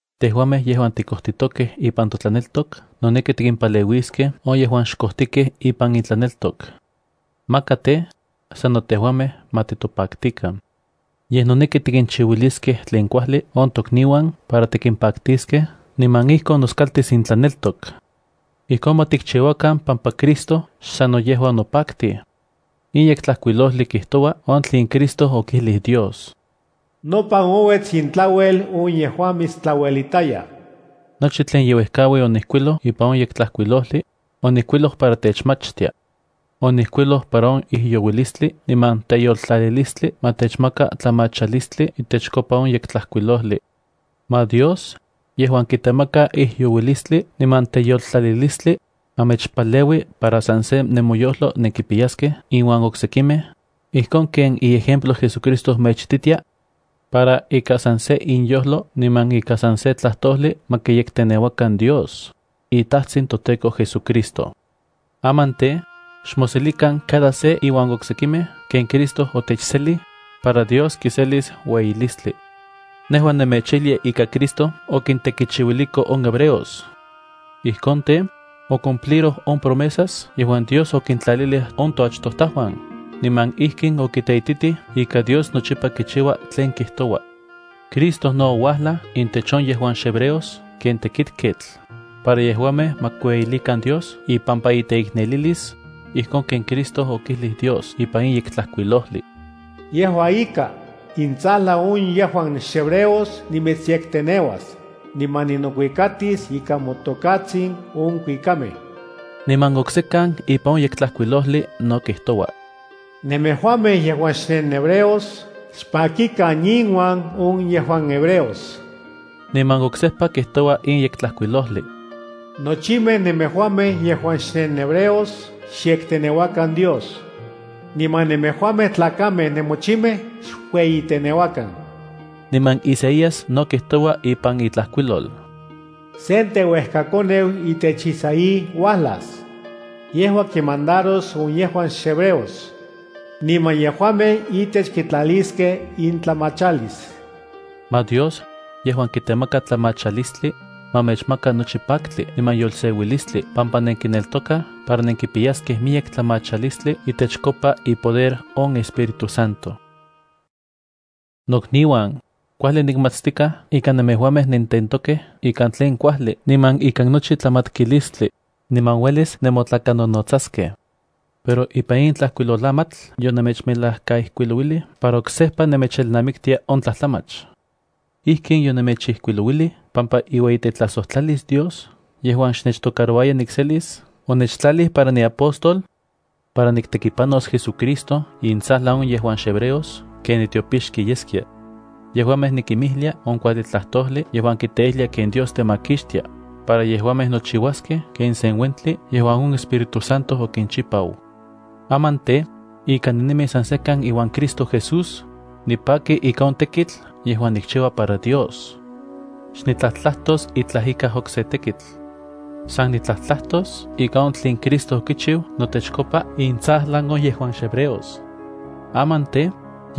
Tejuamej yejuan tikojtikej ipan totlaneltok noneki tikimpaleuiskej on yejuan xkojtikej ipan intlaneltok. Maka tej, sano tejuamej ma titopaktikan. Yej noneki tikinchiuiliskej tlen kuajli on tokniuan para tikimpaktiskej niman ijkon noskaltis intlaneltok. Ijkon ma tikchiuakan pampa Cristo xsanno yejua onopaktij. In Yektlajkuilojli kijtoua on tlen Cristo okijlij Dios: “Nopan ouets intlauel on yejuan mitstlauelitayaj.” Nochi tlen ye uejkaui onijkuiloj ipan on Yektlajkuilojli, onijkuiloj para techmachtia. Onijkuiloj para on ijyouilistli niman teyoltlalilistli ma techmaka tlamachalistli itechkopa on Yektlajkuilojli. Ma Dios, yejuan kitemaka ijyouilistli niman teyoltlalilistli, ma mechpaleui para san se nemoyojlo nenkipiyaskej inuan oksekimej, ijkon ken iejemplo JesuCristo mechititia, para ika san se inyojlo niman ika san se tlajtojli ma kiyekteneuakan Dios, iTajtsin toTEKO JesuCristo. Aman tej, xmoselikan cada se iuan oksekimej ken Cristo otechselij, para Dios kiselis ueyilistli. Nejua nemechijlia ika Cristo okintekichiuiliko on hebreos. Ijkon tej, ocumpliroj on promesas yejuan Dios okintlalilij on toachtojtajuan, niman ijkin okiteititij ika Dios nochipa kichiua tlen kijtoua. Cristo no ouajlaj intech on yejuan xhebreos ken tekitketl para yejuamej ma kiueyilikan Dios ipampa iteiknelilis, ijkon ken Cristo okijlij Dios ipan in Yektlajkuilojli: Yejua ika, intsajlan on yejuan xhebreos nimitsyekteneuas, niman ninokuikatis ikan motokatsin on kuikamej. Niman oksekan ipan on Yektlajkuilojli no kijtoua: Nemejuamej yejuan xnenhebreos xpakikan inuan on yejuan hebreos. Niman oksejpa kijtoua in Yektlajkuilojli: Nochimej nemejuamej yejuan xnenhebreos xyekteneuakan Dios. Niman nemejuamej tlakamej nemochimej xkueyiteneuakan. Niman Isaías no kijtoua ipan itlajkuilol: b Sen teuejkakoneu itech Isaí uajlas. Yejua kinmandaros on yejuan xhebreos. Niman yejuamej itech kitlaliskej intlamachalis. Ma Dios, yejuan kitemaka tlamachalistli, ma mechmaka nochi paktli niman yolseuilistli pampa nenkineltokaj para nenkipiyaskej miyek tlamachalistli itechkopa ipoder on Espíritu Santo. Nokniuan, kuajli nikmatstikaj ika nemejuamej nententokej ikan tlen kuajli niman ikan nochi tlamatkilistli, niman uelis nemotlakanonotsaskej. Pero ipan in tlajkuilolamatl yonemechmejlakaijkuilouilij para oksejpa nemechelnamiktia on tlajtlamach. Ijkin yonemechijkuilouilij pampa iueyitetlajsojtlalis Dios yejuan xnechtocarouaya nikselis onechtlalij para niapóstol, para niktekipanos JesuCristo intsajlan on yejuan xhebreos ken nitiopixki yeskia. Yejuamej nikimijlia on kuajli tlajtojli yejuan kiteijlia ken Dios temakixtia, para yejuamej nochiuaskej ken sen uentli yejuan on Espíritu Santo okinchipau. Aman tej, ika ninemi san sekan iuan Cristo Jesús, nipaki ika on tekitl yejuan nikchiua para Dios. Xnitlajtlajtos itlaj ika okse tekitl. San nitlajtlajtos ika on tlen Cristo okichiu notechkopa intsajlan on yejuan xhebreos. Aman tej,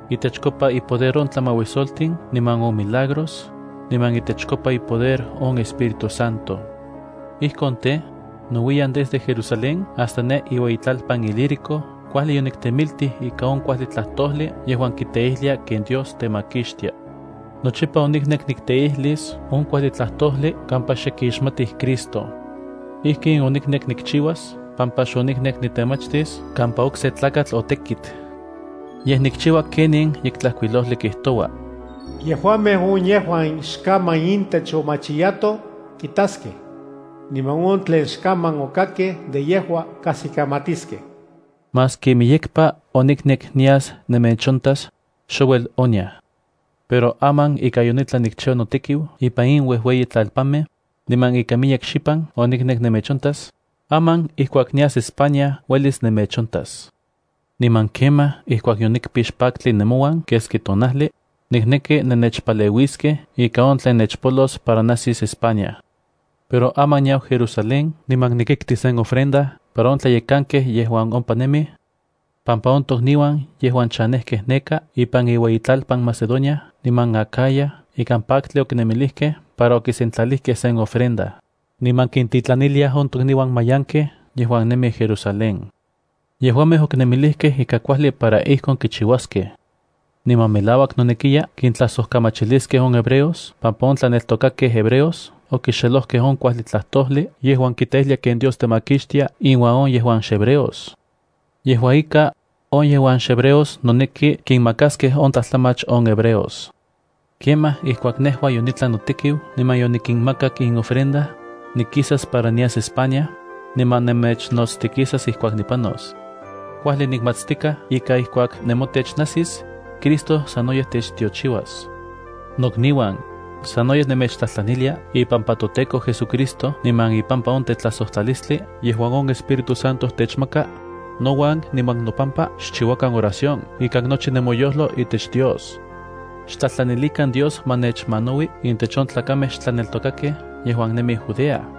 itechkopa ipoder on tlamauisoltin niman on milagros, niman itechkopa ipoder on Espíritu Santo. Ijkon tej, nouiyan desde Jerusalén hasta ne iueyitlalpan Ilírico kuajli yoniktemitij ika on kuajli tlajtojli yejuan kiteijlia ken Dios temakixtia. Nochipa oniknek nikteijlis on kuajli tlajtojli kampa xe kixmatij Cristo. Ijkin oniknek nikchiuas pampa xoniknek nitemachtis kampa okse tlakatl otekit. Yej nikchiua ken in Yektlajkuilojli kijtoua: “Yejuamej on yejuan xkaman intech omachiyato, kitaskej. Niman on tlen xkaman okakkej de yejua, kajsikamatiskej.” Maski miyekpa oniknek nias nemechontas, xouel oniaj. Pero aman ika yonitlan nikchiua notekiu ipan in ueyitlalpanmej, niman ika miyek xipan yoniknek nemechontas, aman ijkuak nias España uelis nemechontas. Niman kemaj ijkuak yonikpix paktli nemouan keski tonajli, nikneki nennechpaleuiskej ika on tlen nechpolos para najsis España. Pero aman niau Jerusalén niman nikikti sen ofrenda para on tlayekankej yejuan ompa nemij, pampa on tokniuan yejuan chanejkej neka ipan iueyitlalpan Macedonia niman Acaya ikan paktli okinemilijkej para okisentlalijkej sen ofrenda, niman kintitlaniliaj on tokniuan mayankej yejuan nemij Jerusalén. Yejuamej okinemilijkej ika kuajli para ijkon kichiuaskej. Niman melauak nonekiya kintlajsojkamachiliskej on hebreos pampa on tlaneltokakej hebreos okixelojkej on kuajli tlajtojli yejuan kiteijlia ken Dios temakixtia inuan on yejuan xhebreos. Yejua ika, on yejuan xhebreos noneki kinmakaskej on tlajtlamach on hebreos. Kemaj ijkuak nejua yonitlan notekiu niman yonikinmakak in ofrenda, nikisas para nias España, niman nemechnotstikisas ijkuak nipanos. Kuajli nikmatstikaj ika ijkuak nemotech najsis, Cristo sanoyej techtiochiuas. Nokniuan, sanoyej nemechtlajtlanilia ipampa toTEKO JesuCristo niman ipampa on tetlajsojtlalistli yejuan on Espíritu Santo techmaka, nouan niman nopampa xchiuakan oración ikan nochi nemoyojlo itech Dios. Xtlajtlanilikan Dios ma nechmanaui intech on tlakamej xtlaneltokakej yejuan nemij Judea.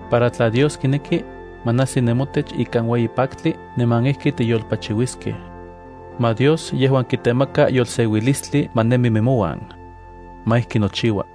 para tla Dios kineki, ma najsi nemotech ikan ueyi paktli niman ijki tiyolpachiuiskej. Ma Dios yejuan kitemaka yolseuilistli ma nemi nemouan. Ma ijki nochiua.